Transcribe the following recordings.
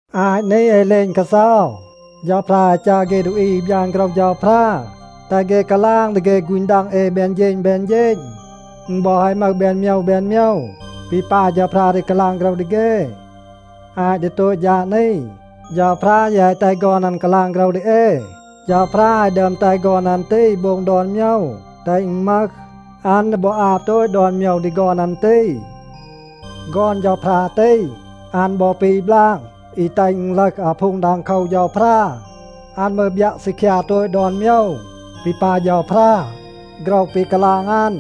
อาต นี แฮะ เหลณ กาเซา, เฌาพรา แฮะ จัร เฆ ดูอี อี บยาน โฆรห เฌาพรา แตห เฆ กาลาง ดี เฆ ฆูณ ดัง เอ แบน เฌณ แบน เฌณ. อึณ บอ แฮะ มึห แบน โมยว แบน โมยว ปี ปาย เฌาพรา ดี กาลาง โฆรห ดี เฆ. อาต ดี โตต ฌาด นี, เฌาพรา ยี แฮะ แตห ฆอน อัน กาลาง โฆรห ดี เอ. เฌาพรา แฮะ ดึอม แตห ฆอน อัน ตี โบง ดอน โมยว, แตห อึณ มึห. อัน ดี บอ อาบ โตต ดอน โมยว ดี ฆอน อัน ตี. ฆอน เฌาพรา ตี, อัน บอ ปี บลาง อี แตห อึณ ลึห อาพูง ดังโคว เฌาพรา. อัน มืร บยัะ ซีคยา โตต ดอน โมยว ปี ปาย เฌาพรา. โฆรห ปี กาลาง อัน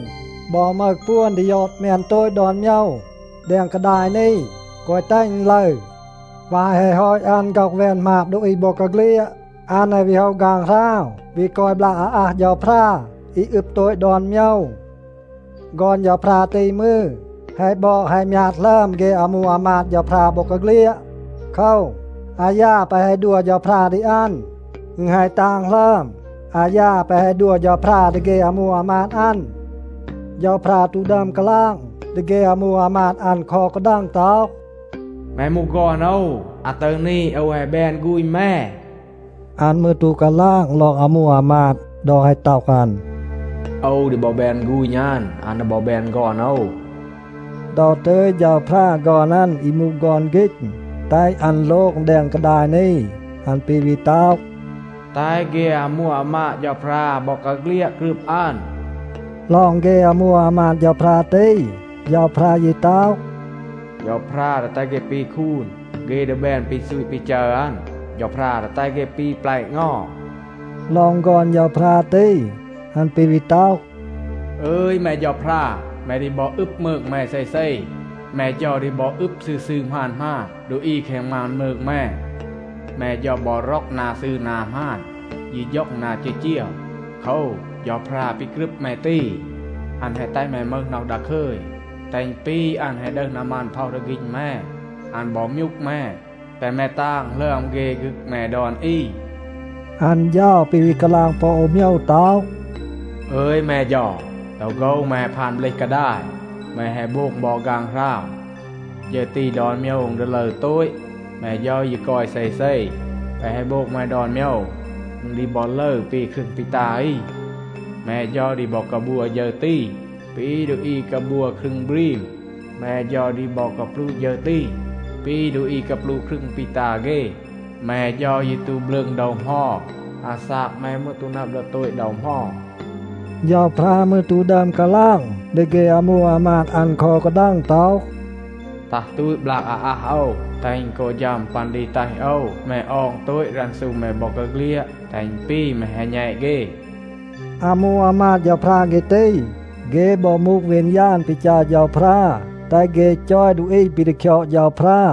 บอ มึห ปวน ดี ยอด แมน โตต ดอน โมยว แดง กาดาย นี, แกวะ แตห อึณ ลึร. วาย แฮะ ฮอต อัน ฆ็อห แวน หมาบ ดูอี บอกาเฆลียด, อัน แฮะ วี โฮะ ฆางหราว วี กอย บลาก อาอัห เฌาพรา อี อึบ โตต ดอน โมยว. ฆอน เฌาพรา ตี มืร, แฮะ บอด แฮะ มยาด หลึอม เฆ อามู อามาด เฌาพรา บอกาเฆลียด. โคว, อายา แปะ แฮะ ดัว เฌาพรา ดี อัน, อึณ แฮะ ตาง หลึอม อายา แปะ แฮะ ดัว เฌาพรา ดี เฆ อามู อามาด อัน. เฌาพรา ตู ดึอม กาลาง ดี เฆ อามู อามาด อัน คอ อู กาดัง ต็อห, “แม มูห ฆอน โอว. อาตึร นี โอว แฮะ แบน ฆูณ แม.” อัน มืร ตู กาลาง ลอง อามู อามาด ดอ แฮะ ต็อห อัน, “โอว ดี บอ แบน ฆูณ อัน, อัน ดี บอ แบน ฆอน โอว.” ดอ ตึย เฌาพรา ฆอน อัน อี มูห ฆอน ฆีณ, แตห อัน โลง แดง กาดาย นี, อัน ปี วี ต็อห, “แตห เฆ อามู อามาด เฌาพรา บอกาเฆลียด กรึบ อัน.” ลอง เฆ อามู อามาด เฌาพรา ตี, เฌาพรา ยี ต็อห, “เฌาพรา ดี แตห เฆ ปี คูน. เฆ ดี แบน ปี ซูต ปี จัร อัน. เฌาพรา ดี แตห เฆ ปี แปละ เงา.” ลอง ฆอน เฌาพรา ตี, อัน ปี วี ต็อห, “อึย แม เฌาพรา, แม ดี บอ อึบ มืง แม เซเซ. แม เฌา ดี บอ อึบ ซืร ซืร หมาน หมาน ดูอี แคง มาน มืง แม. แม เฌา บอ ร็อก นา ซืร นา หมาน, ยี ฌ็อง นา จีจีว. โคว, เฌาพรา ปี กรึบ แม ตี, อัน แฮะ แตห แม มึห น็อห ดาคึย, แตห อึณ ปี อัน แฮะ ดึห นามัน พ็อห ดี ฆีณ แม. อัน บอ มยูก แม, แตห แม ตาง หลึอม เฆ ฆึก แม ดอน อี.” อัน เฌา ปี วี กาลาง ปอ อู โมยว ต็อห, “อึย แม เฌา, ดอ โฆว แม แฮะ พาน เบลห กาดาย. แม แฮะ โบง บอ ฆางหราว. ฌึร ตี, ดอน โมยว อึณ ดี ลึร โตต. แม เฌา ยี กอย เซเซ. แปะ แฮะ โบง แม ดอน โมยว, อึณ ดี บอ ลึร ปี ครึง ปี ตา อี. แม เฌา ดี บอ กาบัว ฌึร ตี, ปี ดูอี กาบัว ครึง บรีม. แม เฌา ดี บอ กาปลูะ ฌึร ตี, ปี ดูอี กาปลูะ ครึง ปี ตา เฆ. แม เฌา ยี ตู บลืง ดอ เหมา. อาซาก แม มืร ตู นับ ดี โตต ดอ เหมา.” เฌาพรา มืร ตู ดึอม กาลาง ดี เฆ อามู อามาด อัน คอ อู กาดัง ต็อห, “ตัห ตูต บลาก อาอัห โอว, แตห อึณ กอ ฌัม ปัน ดี แตห โอว แม ออง โตต รันซู แม บอกาเฆลียด, แตห อึณ ปี แม แฮะ แณต เฆ.” อามู อามาด เฌาพรา เฆ ตี, เฆ บอ มูห วีณาน ปี จัร เฌาพรา, แตห เฆ จอย ดูอี ปี ดี คยอด เฌาพรา.